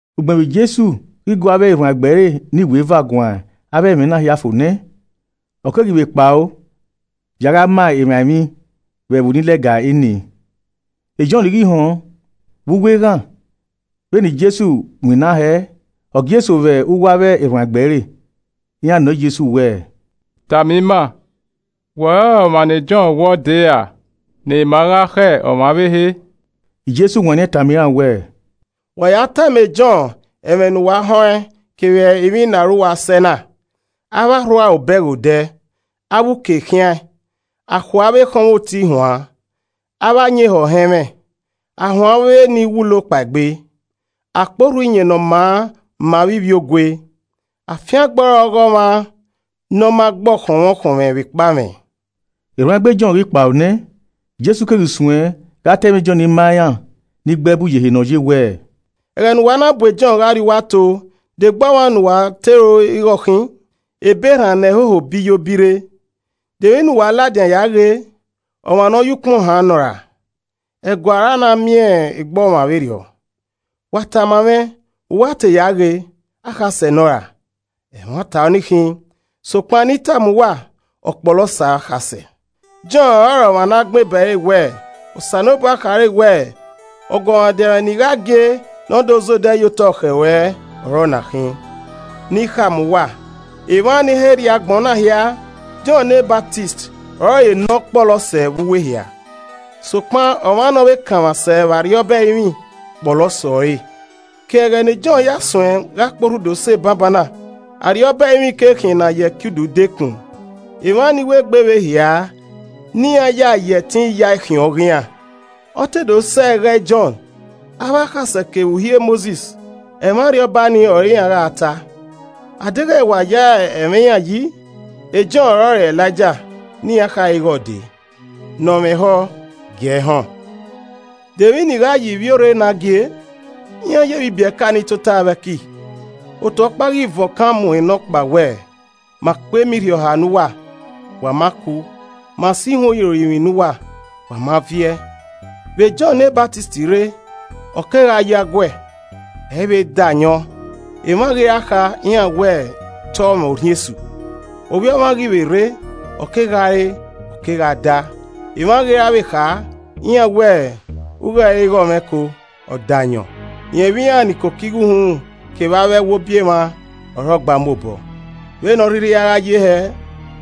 Ugbẹn vbe Jesu ghi gu avbe erhuanegbe ẹre ne iweva guan avbe ẹmwẹ na hia fo nẹ, ọ keghi vbe kpao ya gha ma emwa emwi vbe ẹvbo ni lẹga enii. Jọn ghi họn vbe uwu eghan vbene Jesu winna hẹẹ, ọ gie eso vbe uwu avbe erhuanegbe ẹre. Iran nọ Jesu wẹẹ, “Tama ima, wẹ ọrọre ọmwa ne Jọn wẹẹ ọ dee ra ne ima gha khẹ ọmwa ọvbehe?” Jesu wanniẹn tama iran wẹẹ, “Wa ya tama e Jọn ẹmwẹ ne uwa họn ẹn kevbe emwi ne aro uwa sẹe na. Avbe arhu aro bẹghe odẹ, avbe uke khiaẹn, a khue avbe ekhọnmwoti huan, avbe ayin ehọ họn ẹmwẹ, a huẹn avbe ni wulo kpaegbe, a kporhu Iyẹn Ne ọ maa ma avbe ivbiogue. Afiangbe ọre ọghe ọmwa ne ọ ma gbe ọkhọnmwẹ ọkhọnmwẹ vbekpa mwẹ.” Erhuanegbe Jọn ghi kpao nẹ, Jesu keghi suẹn gha ta ẹmwẹ Jọn ma iran ni gbe ẹbu ye ehe ne ọ ye wẹẹ, “Ẹghẹ ne uwa na bu Jọn gha rrie uwu ato, de egbe ọmwa ne uwa te ro ighe ọ khin? Ebe erhan ne ẹhoho biyo birre? De emwi ne uwa ladian ya ghee? Ọmwa ne ọ ye ukpọn haan nọ ra? Ẹguae ọre a na miẹn egbe ọmwa vberriọ. Wa tama mwẹ, vbe uwa te ya ghe? Akhasẹ nọ ra? Ẹmwata ọ ni khin, sokpan ne I tama uwa, ọ kpọlọ sẹ akhasẹ. Jọn ọrọre ọmwa ne a gbẹn ebe ẹre wẹẹ, ‘Osanobua khare wẹẹ, Ọguọmwadia mwẹ ne I gha gie ne ọ do zẹ odẹ ye otọ khẹ ruẹ ọre ọna khin.’ Ne I khama uwa, emwa ni he rrie agbọn na hia, Jọn ne Ọsamẹ ọrọre ne ọ kpọlọ sẹ vbe uwu ehia. Sokpan, ọmwa ne ọ vbe kanmwa sẹ vbe Arriọba ẹrinmwi kpọlọ sẹ ọre. Ke ẹghẹ ne jọn ya suẹn gha kporhu do sẹ banbanna, Arriọba ẹrinmwi ke khian ne a ya ẹkiudu dekun, emwa ni wegbe vbe hia ne iran ya ẹtin yae khian ọghe iran. Ọ te do sẹ ẹghẹ e Jọn, avbe akhasẹ kevbe Uhi e Mosis, ẹmwẹ Arriọba ni ọre iran gha ta. Adeghẹ wa gha ya ẹmwẹ iran yi, e Jọn ọrọre Elaija ne iran khare ighẹ ọ dee. Ne ọ mwẹ ehọ gie ẹ họn. “De emwi ne I gha ya ivbiorre na gie? Iran yevbe ibiẹka ni tota vbe ẹki. Otu ọkpa ghi van okan mu nọkpa wẹẹ, ‘Ma kpe ema irhiọha ne uwa, wa ma ku. Ma so ihuan irorinmwi ne uwa, wa ma viẹ.’ Vbe Jọn ne Ọsamẹ rre, ọ kegha yo aguẹ, ẹ i vbe da ayọn. Emwa ghi ra kha, iran wẹ, ‘Te ọ mwẹ orhiọn esu.’ Ovbi Ọmwa ghi vbe rre, ọ kegha re, ọ kegha da. Emwa ghi ra vbe kha, iran wẹẹ, ‘U ghe ẹre ighe ọmwẹko, ọdayọn, rẹn vbe iran ni koko igho uhunmwu kevbe avbe ẹwobi emwa ọre ọ gba mu obọ!’ Vbene ọ rhirhi a gha ye hẹ,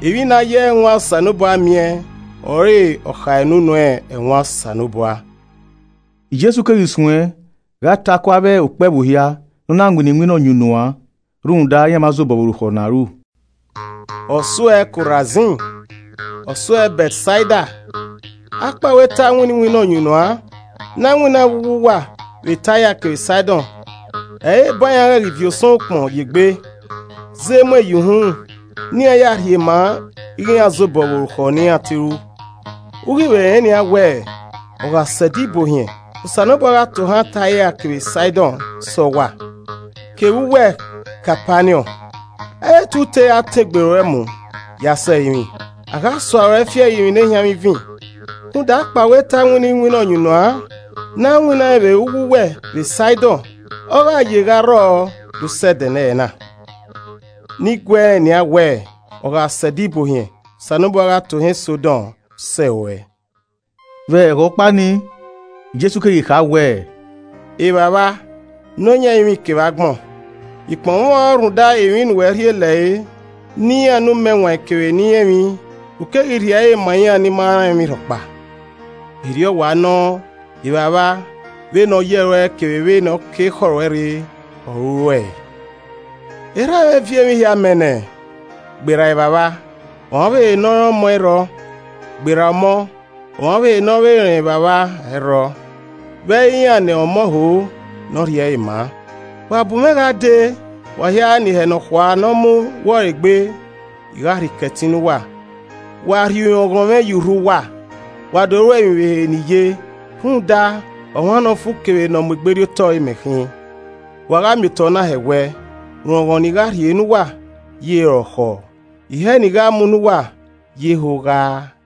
emwi ne a ya ẹwaẹn Osanobua miẹn, ọre ọ kha ene unu ẹwaẹn Osanobua.” Jesu keghi suẹ gha ta ku avbe okpẹvbo hia ne ọ na winna iwinna ọyunnuan, rhunmwuda iran ma zobọ vbe orukhọ ne a ru. “Ọ suẹ Korazin! Ọ suẹ Bẹtsaida! Akpawẹ te a winna iwinna ọyunnuan ne a winnaẹn vbe uwu uwa vbe Taia kevbe Saidọn, ẹ i re eban iran ghẹ ghi viọ osọnmwẹ ukpọn ye egbe, zẹ emuẹn yan uhunmwu ne iran ya rhie ma ighe iran zobọ vbe orukhọ ne iran te ru. U ghi vbe rẹn nian wẹ, ọ gha sẹ Ẹdẹ Ibuohiẹn, Osanobua gha tohan Taia kevbe Saidọn sẹ uwa. Kevbe uwẹ Kapaniọn! Ẹ i re te u tera tọn egbe ruẹ mu ya sẹ ẹrinmwi? A gha sua ruẹ fi ẹrinmwi nehianmwivin! Rhunmwuda, akpawẹ te a winna iwinna ọyunnuan ne a winnaẹn vbe uwu uwẹ vbe Saidọn, ọ gha ye gha rrọọ do sẹ ẹdẹnẹrẹ na. Ne I guẹ rẹn nian wẹẹ, ọ gha sẹ Ẹdẹ Ibuohiẹn, Osanobua gha tohan Sọdom sẹ ruẹ.” Vbe ẹghẹ ọkpa ni, Jesu keghi kha wẹẹ, “Evbavba Nọyaẹnmwa ẹrinmwi kevbe agbọn, I kpọnmwẹ ọn rhunmwuda, emwi ne uwẹ rhie lẹre ne iran ne umẹwaẹn kevbe ni rẹn emwi, u keghi rhie ẹre ma iran ni ma rẹn emwirhọkpa. Erriọ wa nọ, Evba vba, vbene ọ yẹ ruẹ kevbe vbene ọ ke ekhọe ruẹ rre ọre u ru ẹe. “Erhamwẹ viọ emwi hia mẹ nẹ. Gberra Evbavba, ọmwa ọvbehe ne ọ rẹn ọmọ ẹ i rrọọ, gberra ọmọ, ọmwa ọvbehe ne ọ vbe rẹn Evbavba, ẹ i rrọọ, vbe ẹ i re iran ne ọmọ ho ne ọ rhie ẹre maa. “Wa bu mwẹ gha dee, wa hia ne ihẹ nọkhua ne ọ mu wọ ẹre egbe, I gha rhie ikẹtin ne uwa. Wa rhie urọnghọn mwẹ ye urhu uwa, wa do ruẹ emwi vbe ehe ne I ye rhunmwuda, ọmwa ne ọ fu kevbe ne ọ mu egberriotọ ọre imẹ khin, wa gha miotọ na hẹwẹ. Urọnghọn ne I gha rhie ne uwa ye rọkhọọ, ihẹ ne I gha mu ne uwa ye hogha aa.”